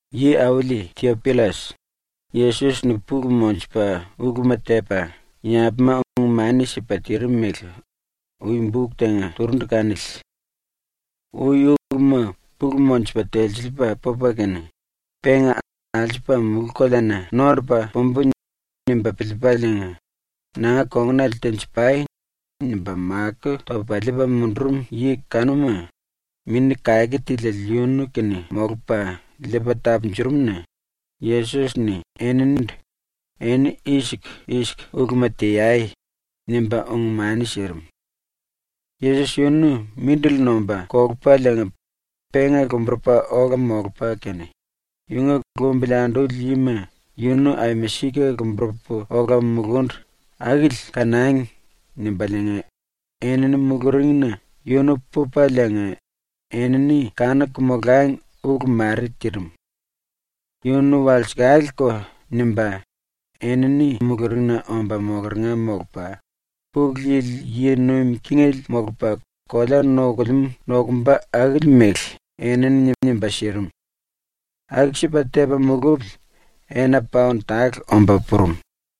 Yi-Auli Tiopillas, Yesos-ni pulu monjupa uluma tepa yambuma ung-mani sipa tirim mele ui buk tenga turundu kanili. Ui uluma pulu monjupa telsiliipa pupa kene, penga ‘Alsupa mulú-koleana nondupa pumbu.’ nimba piliipaliinga, “Nanga kongunale tenji-pai.” nimba makó topa liipa mundurum yi kanuma, Mini Kake Tiliele yunu kene molupa liipa tapunjurum-na Yesos-ni eninindu “Eni i-siku i-siku uluma teai.” nimba ung-mani sirim. Yesos yunu mindili nomba kolupaliinga penga lomburupa ola molupa kene, yunga ‘Lumbili anduli yima yunu aima sika lomburupu ola mulundu akili kanangi.’ nimbaliinga enini muluringna yunu pupaliinga enini kanuku molangi ulu mare tirim. Yunu walsekale-ko nimba enini muluringna omba mokeringa molupa, Pulu Yili yi nuim kingele molupa kolea nokulemú nokumba akili mele enini nimba sirim. Aku-sipa tepa mulupili ena paon tale omba purum.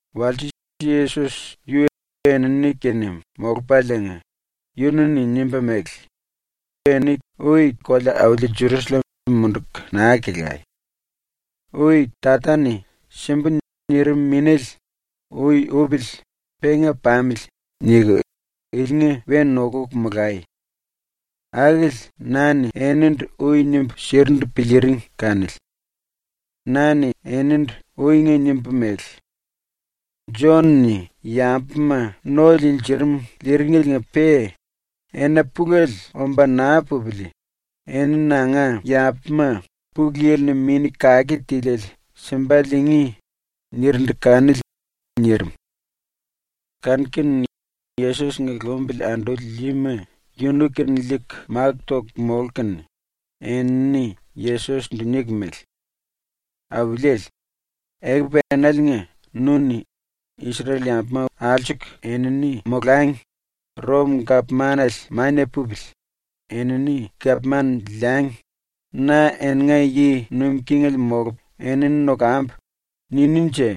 Walse Yesos yu enini-kene molupaliinga yunu-ni nimba mele: “Eni ui kolea-auli Jerusallem munduku naa kelai. Ui Tata-ni “Simbu.” nirim Minéle ‘Ui upili penga pamili.’ niku ilinga we nokuku molai. Akili na-ni enindu ui nimbu sirindu piliiring kanili. Na-ni enindu uinga nimbu mele: “Jon-ni yambuma no liinjirim liiringeliinga-pe ena pulele omba naa pupili eni nanga yambuma Pulu Yili-ni Mini Kake Tiliele simba liingí.” nirindu kanili.” nirim. Kanu-kene Yesos-nga lumbili anduli yima yunu kene liiku máku toku molku kene, enini Yesos-ndu niku mele: “Auliele, ekupu enaliinga nu-ni “Isrel-yambuma alsuku enini molangi, Rom-gapmanale mania pupili, enini gapman liangi, na eninga yi nuim kingele molupu enini nokambu.” ninínje?”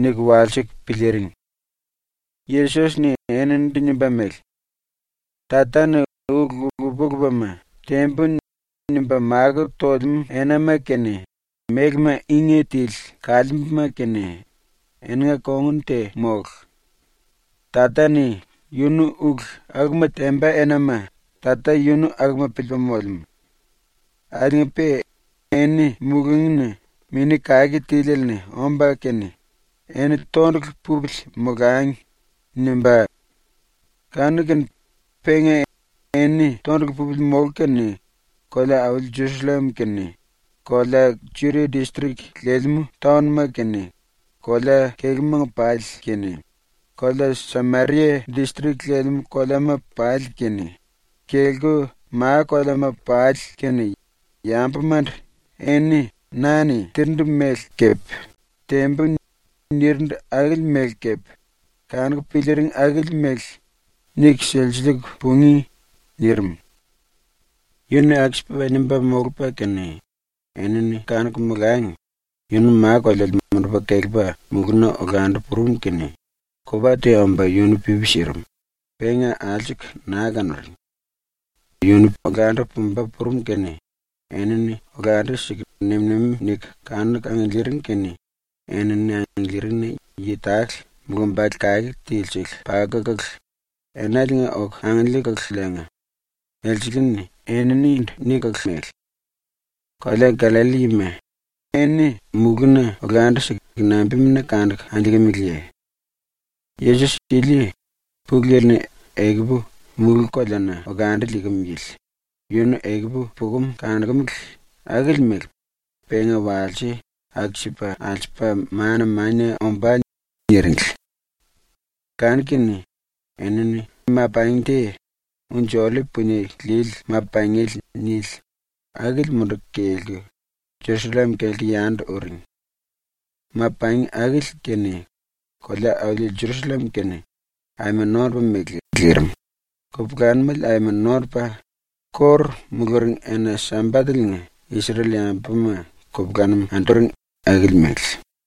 niku walsiku piliiring. Yesos-ni eninindu nimba mele: “Tata-ni ulu lupa-lupama “Tembu.” nimba makó tolemú enama kene mélema ínge tili kaliimbuma kene eninga kongun te mólu. Tata-ni yunu ulu akuma temba enama Tata yunu akuma piliipa molemú. Akiliinga-pe eni mulungína Mini Kake Tiliele-ni omba kene ‘Eni tondulu pupili molangi.’ nimbá. Kanu-kene penga eni tondulu pupili molku kene kolea-auli Jerusallem kene, kolea Judia distrik lelemú taon-ma kene kolea-kelúmanga pali kene, kolea Sameria distrik lelemú koleama pali kene, kelku ma-koleama pali kene yambumandu eni na-ni tirindu mele kepe “Tembu.” nirindu akili mele kepe kanuku piliiring akili mele niku silsiliiku pungí.” nirim. Yu-ni aku-sipa nimba molupa kene, enini kanuku molangi yunu ma-koleale mundupa kelepa mulúna olandu purum kene kupa te omba yunu pipi sirim, penga alsuku naa kanuring. Yunu olandu pumba purum kene enini olandu-siku nem-nemi niku kanuku angiliiring kene enini angiliiringina yi tale mulumbale kake tilisele pakukulu enaliinga oku angiliikululiinga, elsele-ni eninindu nikulu mele: “Kolea Gallalli yima, eni mulúna olandu-siku nambimuna kanuku angiliikimiliye? Yesos ili, Pulu Yili-ni ekupu mulú-koleana olandu liikim yili, yunu ekupu pukum kanokumele akili mele penga walse aku-sipa alsupa mana-mania ombá.” niringli. Kanu-kene enini ma-pangi te, ‘Unji-Ollip Punie Lili Ma-Pangiele’ nili, akili munduku kelku Jerusallem kelku yandu uring. Ma-pangi akili kene kolea-auli ⸤Jerusallem⸥ kene aima nondupa mele lirim, kupulanumele aima nondupa, ⸤kóru muluring⸥ ena-Sambatele-nga Isrel-yambuma kupulanum anduring akili mele.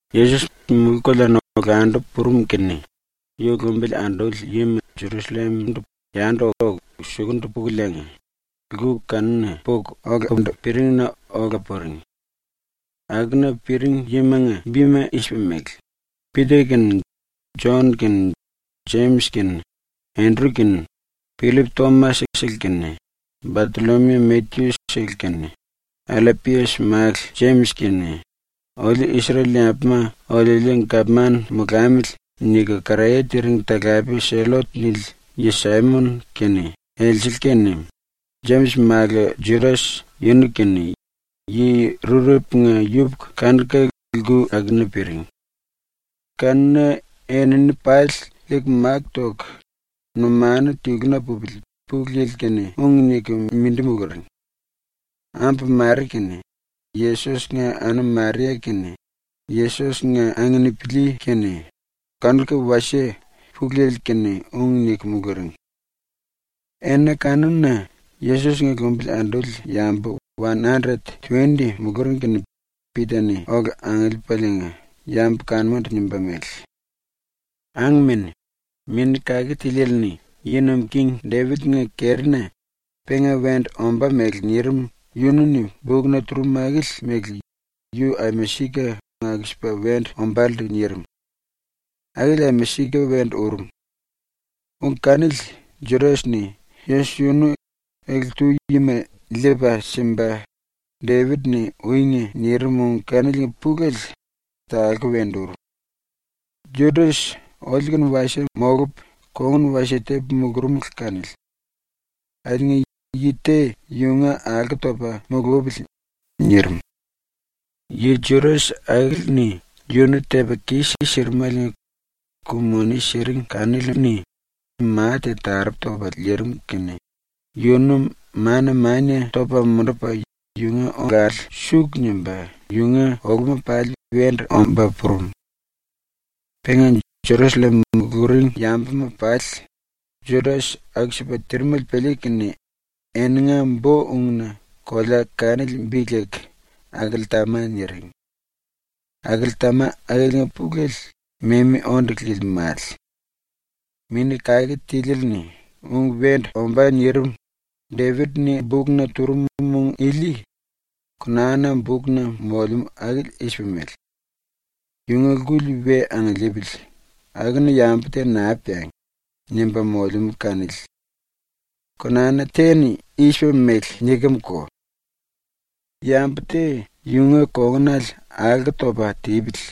Yesos mulú-koleana olandu purum kene yu lumbili anduli yima Jerusallem-ndu yandu oku sukundu pukuliinga, lku kanuna puku olakundu piringna ola puring. Akuna piring yimanga bima i-sipa mele: Pita kene Jon kene Jemis kene Endru kene, Pillip Tomas-sele kene, Batollomiu Matyu-sele kene, Allapias málu Jemis kene “Oliu Isrel-yambuma oliuliu gapman molamili.” niku karaye tiring talape ‘Sellot’ nili yi Saimon kene elsele kene, Jemis málu Judas yunu kene, yi rurepunga yupuku kanuka lku akuna piring. Kanuna enini pali liiku máku toku, numanu tiluna pupili Pulu Yili-kene ung niku mindi muluring. Ambu mare kene Yesos-nga anum Maria kene Yesos-nga anginipili kene kanuka wasie Pulu Yili-kene ung niku muluring. Ena kanuna Yesos-nga lumbili anduli yambu wan andret tuwendi muluring kene Pita-ni ola angiliipaliinga yambu kanumandu nimba mele: “Angmene, Mini Kake Tiliele-ni ⸤yi nuim king⸥ Depit-nga kerina penga wendu ombá mele nirim yunu-ni bukna turum akili mele yu aima sika aku-sipa wendu ombálendu nirim. Akili aima sika wendu urum. Ung kanili Judas-ni Yesos yunu ele-tu yima liipa simba Depit-ni uinga nirim ung kaniliinga pulele talku wendu urum. Judas oliu-kene wasie molupu kongun wasie tepu mulurumulu kanili. Akiliinga yi te yunga alko topa mulupili.” nirim. (Yi Judas akili-ni yunu tepa kis-sirimeliinga ku-moni siring kanili-ni ma te taropu topa liirim kene yunu mana-mania topa mundupa yunga olale suku nimba yunga oluma pali wendu omba purum. Penga Jerusallem muluring yambuma pali Judas aku-sipa tirimele piliiku kene eninga bo-ungna kolea kanili bi leku ‘Akeltama’ niring. ‘Akeltama’ akiliinga pulele ‘Memi Onde Lili Male’.) “Mini Kake Tiliele-ni ung wendu ombá nirim Depit-ni bukna turum ung ili Konana bukna molemú akili i-sipa mele: ‘Yunga lkuli we angiliipili, akuna yambu te naa peangi.’ nimba molemú kanili. Konana te-ni i-sipa mele nikemko: ‘Yambu te yunga kongunale alko topa tipili.’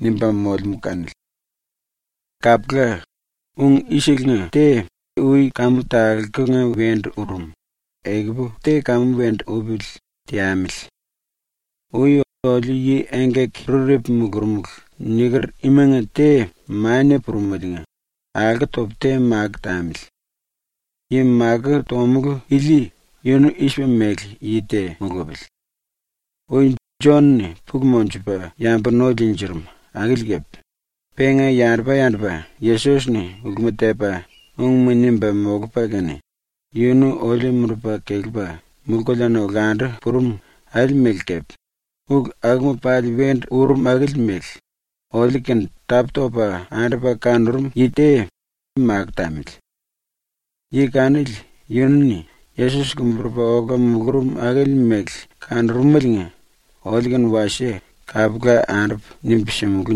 nimba molemú kanili. “Kapula, ung i-selenga te ui kamu talkunga wendu urum, ekupu te kamu wendu upili teamili. Ui oliu yi engkaki-rurepu mulurumulu niker imanga te mania purumeliinga alko topu te makó tamili. Yi makó tomulú ili yunu i-sipa mele yi te mulupili: Ui Jon-ni pulu monjupa yambu no liinjirim akili kepe, penga yandupa-yandupa Yesos-ni uluma tepa ungma nimba molupa kene, yunu oliu mundupa kelepa mulú-koleana olandu purum akili mele kepe, ulu akuma pali wendu urum akili mele, oliu kene tapú-topa andupa kanurum yi te makó tamili. Yi kanili yunu-ni Yesos lomburupa ola mulurum akili mele kanurumeliinga oliu-kene wasie kapula andupu nimbu simulú.”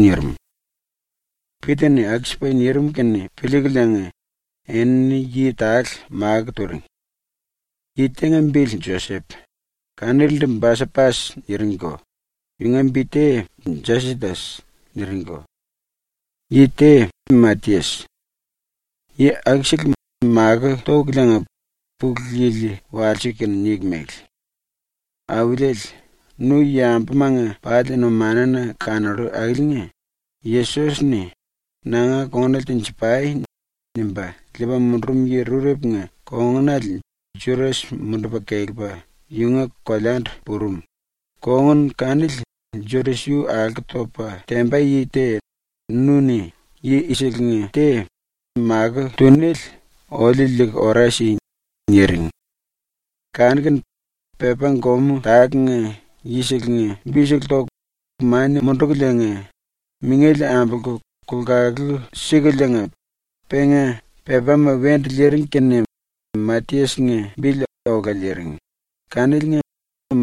nirim. Pita-ni aku-sipa nirim kene piliikuliinga enini yi tale makó turing. Yi tenga bili Josep, kanilindu ‘Basapas’ niringko, (yunga bi te ‘Jasitas’ niringko;) yi te Matias. Yi akusele makó tokuliinga Pulu Yili walsiku kene niku mele: “Auliele, nu yambumanga pali numanuna kanollu akiliinga Yesos-ni “Nanga kongunale tenji-pai.” nimba liipa mundurum yi rurepunga kongunale Judas mundupa kelepa yunga koleandu purum, kongun kanili Judas yu alko topa temba yi te nu-ni yi i-selenga te makó túnele oliu liiku ora si.” niring. Kanu-kene pepá-gomú tálenga yiselenga bisele toku mania mundukuliinga mingele ambolku kulkalu sikuliinga penga pepáma wendu liiring kene Matias-nga bili ola liiring, kaniliinga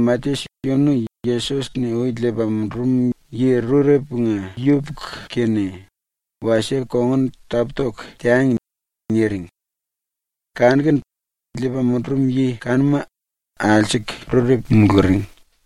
“Matias yunu Yesos-ni ui liipa mundurum yi rurepunga yupuku-kene wasie kongun tapú-toku teangi.” niring. Kanu-kene liipa mundurum yi kanuma alsuku rurepu muluring.